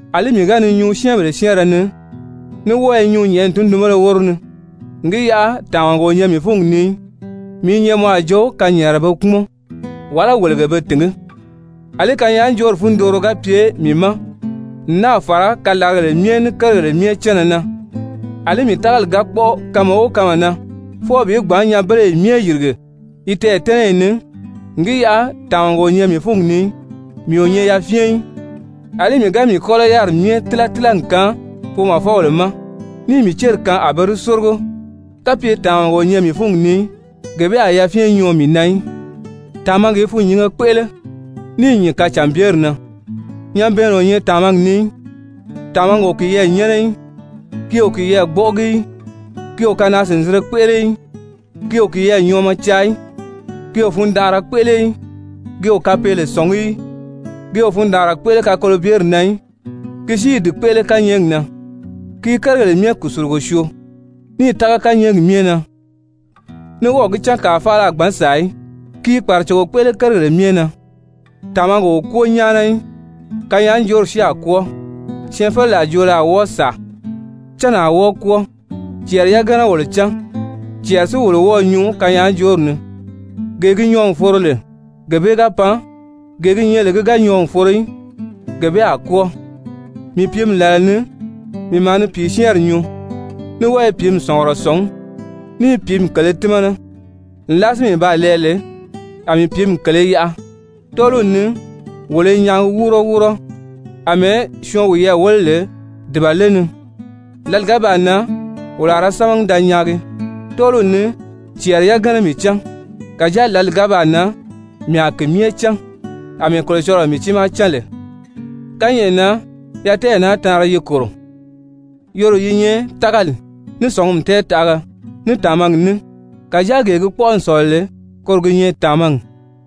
Alí mii ga ni nyuu syɛ́ɛnbèle syɛ́ɛnrɛ ni, ní wɔ́ɔ i nyuu nyɛ̀ʔɛni tundunbéle wóro ni n gi yaʔa tàmaga o nyɛ mii fúngi ni í, mii i nyɛ mɔ a jo kanyɛɛnrɛ be kpúmɔn, wàlá wèlege be tìngí. Alí kanyaajoori fundooro ga pye mii ma n náà fàra kalaragèle myɛ ní kérigèle myɛ cánna na, àlí mii tágali ga kpɔ́ʔɔ kanma o kanma na fwɔɔ bi gbǎn nyanbeleyi myɛ yìrige yi tɛɛ̀tɛ́nɛyi ni n gi yaʔa tàmaga o nyɛ mii fúngi ni í, mii o nyɛ yafyɛn í. Alí mii ga mii kɔ́lɔ yáriri myɛ tíla tíla n kaan foomɔfɔbèle ma, níì mii céri kaan a be di sórigo, kapye tàmaga o nyɛ mii fúngi ni í, gee bee a yafyɛn nyɔɔ mii na í. Tàmagi i fûnnyinge kpéʔele, níì nyìn kacànbyeri na, nyabɛɛnnɛ o nyɛ tàmagi ni í. Tàmagi o kiyɛɛ nyɛ́nɛ í, ki o kiyɛɛ gbɔ́ʔɔgi í, ki o kanaa-sìnzinre kpéʔele í, ki o kiyɛɛ nyɔɔmɔ caa í, ki o fundanʔara kpéʔele í, ki o kapeele sɔ̀ngí í, ki o fundaanra kpéʔele kakolobyeri na í, ki si i di kpéʔele kányɛɛgi na. Ki i kérigèle myɛ kùsulugo syoo, níì tága kányɛɛgi myɛ na, ní wɔ́ɔ̀ gi cán kàa faala a gbǎn sàa í. Ki i kpàracogo kpéʔele kérigèle myɛ na. Tàmagi o kwóo nyáana í. Kanyaajoori si a kwɔ́ɔ, syɛɛnfeleraa joolo a wɔ́ɔ sàa, cánni a wɔ́ɔ kwɔ́ɔ. Cɛɛri yagana wolo cán, cɛɛri si wolo wɔ́ɔ̄ nyuu kanyaajoori ni. Gee gi nyɔɔ n foro lè, gee bee ga pan, gee gi nyɛ lè ki ga nyɔɔ n foro í, gee bee a kwɔ́ɔ. Mii pìími làla ni, mii maa ni pìisyɛɛnri nyuu, ní wɔ́ɔ i pìími sɔ̀ngurɔ sɔ̀ngí, ní i pìími kèlē tímana. Nlaa si mii baa lɛɛ lè, a mii pìími kèlē yaʔa. Tɔ́ɔliw ni wolo i nyaagi wúuro wúuro, àmɛɛ syɔɔn wiyɛɛ wéle lè dùbale ni, lǎli ga baa nan, wolo a ra sámagi da nyaagi. Tɔ́ɔliw ni cɛɛri yagana mii cán, kàjáa lǎli bee ga baa nan, mii a ki myɛ cán àmɛɛ Kolocɔlɔɔ mii tiimaa cán lè. Kányɛʔɛ na yatɛɛyi naa taanri yi kòro, yoro yi nyɛ tágali, ní sɔ̀ngumi tɛɛtaʔaga, ní tàmagi ní. Kàjáa gee gi kpɔ́ʔɔ n sɔ̀lɔ lè, koro gi nyɛ tàmagi.